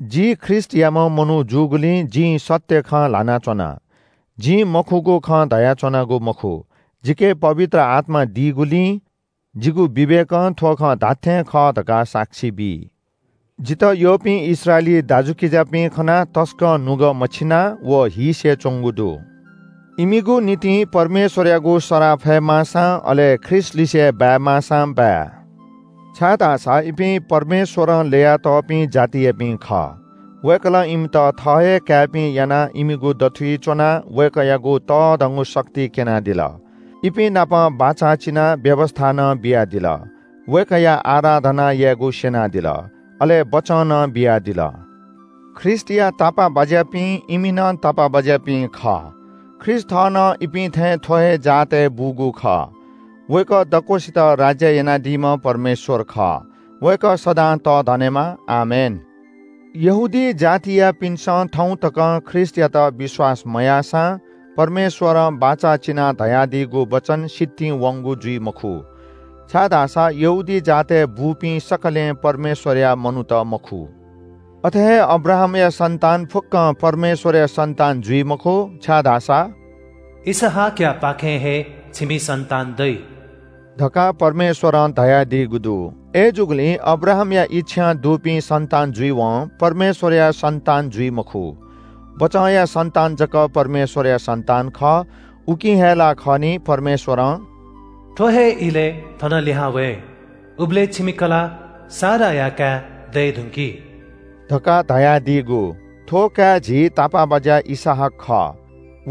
जि ख्रीष्‍टयाम्‍ह मनू जूगुलिं जिं सत्‍य खँ ल्‍हाना च्‍वना। जिं मखुगु खँ धयाच्‍वनागु मखु। जिके पवित्र आत्‍मा दीगुलिं जिगु विवेकं थ्‍व खँ धात्‍थें खः धकाः साक्षी बी। जितः यःपिं इस्राएली दाजुकिजापिं खनाः जि तसकं नुगः मछिं अले जिगु नुगः हीसे च्‍वंगु दु। इमिगु निंतिं परमेश्‍वरयागु सराः फयेमाःसां, अले ख्रीष्‍टलिसे बाय्‌माःसां बाय्, छाय्‌धाःसा इपिं परमेश्‍वरं ल्‍ययातःपिं जातियापिं खः। वय्‌कलं इमित थः हे काय्‌पिं यानाः इमिगु दथुइ च्‍वनाः वय्‌कःयागु तःधंगु शक्ति क्‍यनादिल। इपिं नाप बाचा चिनाः व्‍यवस्‍था नं बियादिल। वय्‌कःया आराधना यायेगु स्‍यनादिल, अले बचं नं बियादिल। ख्रीष्‍टया तापाःबाज्‍यापिं इमि नं तापाःबाज्‍यापिं खः। ख्रीष्‍ट थः नं इपिं थें थ्‍व हे जातय् बूगु खः। वय्‌कः दक्‍वसित राज्‍य यानादीम्‍ह परमेश्‍वर खः, वय्‌कः सदां तःधनेमा। आमेन। यहूदी जातयापिन्‍सं थौं तकं ख्रीष्‍टयात विश्‍वास मयाःसां परमेश्‍वरं बाचा चिनाः धयादीगु वचन सितिं वंगु जुइ मखु। छाय्‌धाःसा यहूदी जातय् बूपिं सकलें परमेश्‍वरया मनूत मखु। अथे हे अब्राहामया सन्‍तान फुक्‍कं परमेश्‍वरया सन्‍तान जुइ मखु। छाय्‌धाःसा “इसहाकयापाखें हे छिमि सन्‍तान दइ” धकाः परमेश्‍वरं धयादीगु दु। अय्‌जूगुलिं अब्राहामया इच्‍छां दुपिं सन्‍तान जुइवं परमेश्‍वरया सन्‍तान जुइ मखु। बचंया सन्‍तान जक परमेश्‍वरया सन्‍तान खः। उकिं हे ला खः नि, परमेश्‍वरं “थ्‍व हे इलय् थन लिहां वये, उबलय् छिमि कलाः साराया काय् दये धुंकी” धकाः धयादीगु। थ्‍व काय् झी तापाःबाज्‍या इसहाक खः।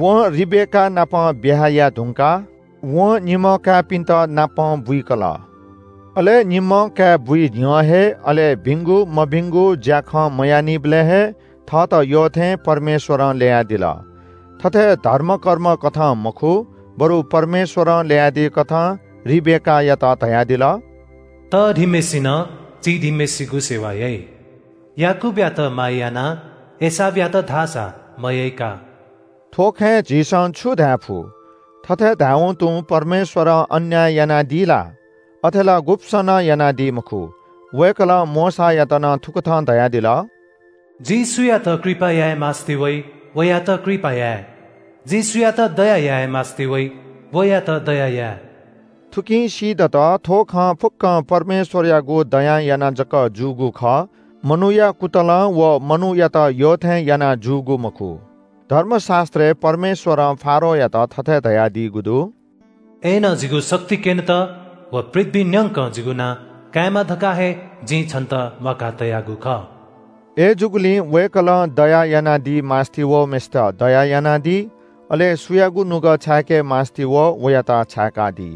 वं रिबेकानापं ब्‍याहा याये धुंकाः वं निम्‍ह काय्‌पिन्‍त नापं बुइकल। अले निम्‍हं काय् बुइ न्‍ह्यः हे, अले भिंगु मभिंगु ज्‍याखँ मयाःनिबलय् हे थःत यःथें परमेश्‍वरं ल्‍ययादिल। थथे धर्मकर्मकथं मखु, बरु परमेश्‍वरं ल्‍ययादीकथं रिबेकायात धयादिल – “तःधीम्‍हय्‌सिनं चीधीम्‍हय्‌सिगु सेवा याइ।” “याकूबयात माया याना, एसावयात धाःसा मयय्‌का।” थ्‍व खँय् झीसं छु धायेफु? थथे धायेवं तुं परमेश्‍वरं अन्‍याय यानादी ला? अथे ला गुब्‍सं नं यानादी मखु। वय्‌कलं मोशायात नं थुकथं धयादिल – “जिं सुयात कृपा याये मास्‍ति वइ वयात कृपा याये। जिं सुयात दया याये मास्‍ति वइ वयात दया याये।” थुकिं सीदत, थ्‍व खँ फुक्‍कं परमेश्‍वरयागु दयां यानाः जक जूगु खः, मनूया कुतलं व मनूयात यःथें यानाः जूगु मखु। धर्मशास्‍त्रय् परमेश्‍वरं फारोयात थथे धयादीगु दु – “अय्‌नं जिगु शक्ति क्‍यनेत व पृथ्‍वीइ न्‍यंक जिगु नां कायेमा धकाः हे जिं छन्‍त म्‍वाकातयागु खः।” अय्‌जूगुलिं वय्‌कलं दया यानादी मास्‍ति वःम्‍हय्‌सित दया यानादी। अले सुयागु नुगः छाय्‌के मास्‍ति वः वयात छाय्‌कादी।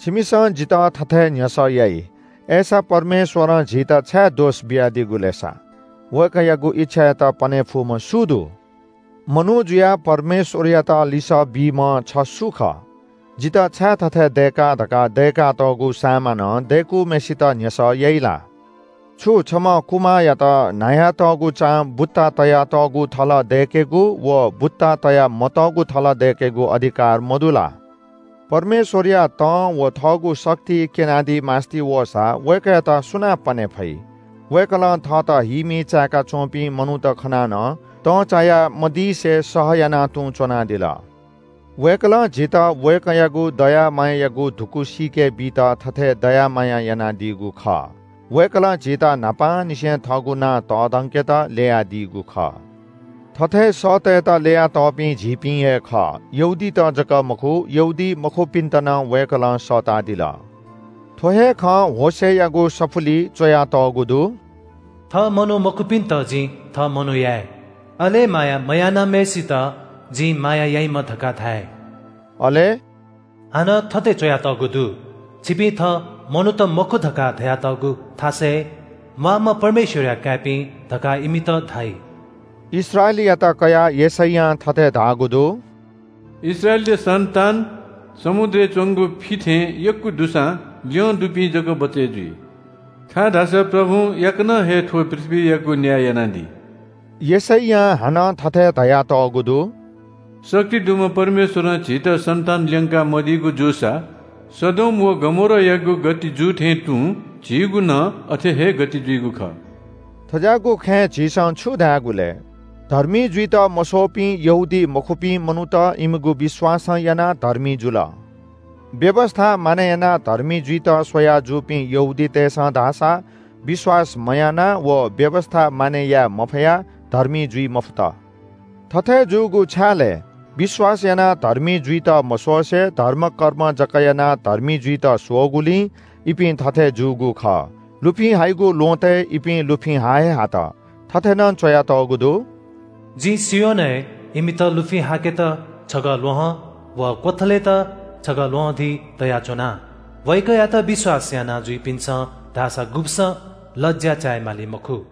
छिमिसं जितः थथे न्‍ह्यसः याइ – “अय्‌सा परमेश्‍वरं झीत छाय् दोष बियादीगु लय् सा?” वय्‌कःयागु इच्‍छायात पने फुम्‍ह सु दु? मनू जुयाः परमेश्‍वरयात लिसः बीम्‍ह छ सु खः? जितः छाय् थथे दय्‌का धकाः दय्‌कातःगु सामानं दय्‌कूम्‍हय्‌सित न्‍ह्यसः याइ ला? छु छम्‍ह कुमाःयात न्‍हायातःगु चां बुत्ता तयातःगु थल दय्‌केगु व बुत्ता तया मतःगु थल दय्‌केगु अधिकार मदु ला? परमेश्‍वरया तं व थःगु शक्ति क्‍यनादी मास्‍ति वःसा वय्‌कःयात सुनां पने फइ? वय्‌कलं थःत हीमी चाय्‌का च्‍वंपिं मनूत खनाः नं तंचाया मदिसे सहयाना तुं च्‍वनादिल। वय्‌कलं झीत वय्‌कःयागु दया मायायागु धुकू सीके बीत थथे दया माया यानादीगु खः। वय्‌कलं झीत न्‍हापांनिसें थःगु नां तःधंकेत ल्‍ययादीगु खः। थथे सःतेत ल्‍ययातःपिं झीपिं हे खः। यहूदीत जक मखु, यहूदीमखुपिन्‍त नं वय्‌कलं सःतादिल। थ्‍व हे खँ होशेयागु सफुलिइ च्‍वयातःगु दु – “थः मनू मखुपिन्‍त जिं थः मनू याये, अले माया मयानाम्‍हय्‌सित जिं ‘माया याइम्‍ह’ धकाः धाये।” अले “हानं थथे च्‍वयातःगु दु – ‘छिपिं थः मनूत मखु’ धकाः धयातःगु थासय् ‘म्‍वाःम्‍ह परमेश्‍वरया काय्‌पिं धकाः इमित धाइ।’” इस्राएलयात कयाः यशैयां थथे धाःगु दु – “इस्राएलया सन्‍तान समुद्रय् च्‍वंगु फि थें यक्‍व दुसां ल्‍यंदुपिं जक बचय् जुइ, छाय्‌धाःसा प्रभुं याकनं हे थ्‍व पृथ्‍वीयागु न्‍याय यानादी।” यशैयां हानं थथे धयातःगु दु – “दक्‍व शक्ति दुम्‍ह परमेश्‍वरं झीत सन्‍तान ल्‍यंका मदीगु जूसा सदोम व गमोरायागु गति जू थें तुं झीगु नं अथे हे गति जुइगु खः।” थज्‍याःगु खँय् झीसं छु धायेगु लय्? धर्मी जुइत मस्‍वःपिं यहूदीमखुपिं मनूत इमिगु विश्‍वासं यानाः धर्मी जुल। व्‍यवस्‍था मानय् यानाः धर्मी जुइत स्‍वयाः जूपिं यहूदीतय्‌सं धाःसा विश्‍वास मयानाः व व्‍यवस्‍था मानय् याये मफयाः धर्मी जुइ मफुत। थथे जूगु छाय् लय्? विश्‍वास यानाः धर्मी जुइत मस्‍वसे धर्मकर्म जक यानाः धर्मी जुइत स्‍वःगुलिं इपिं थथे जूगु खः। लुफिं हाइगु ल्‍वहँतय् इपिं लुफिं हा हे हात। थथे नं च्‍वयातःगु दु – “जिं सियोनय् इमित लुफिं हाकेत छगः ल्‍वहं व क्‍वथलेत छगः ल्‍वहंधी तयाच्‍वना। वय्‌कःयात विश्‍वास यानाजुइपिन्‍सं धाःसा गुब्‍सं लज्‍या चाय् माली मखु।”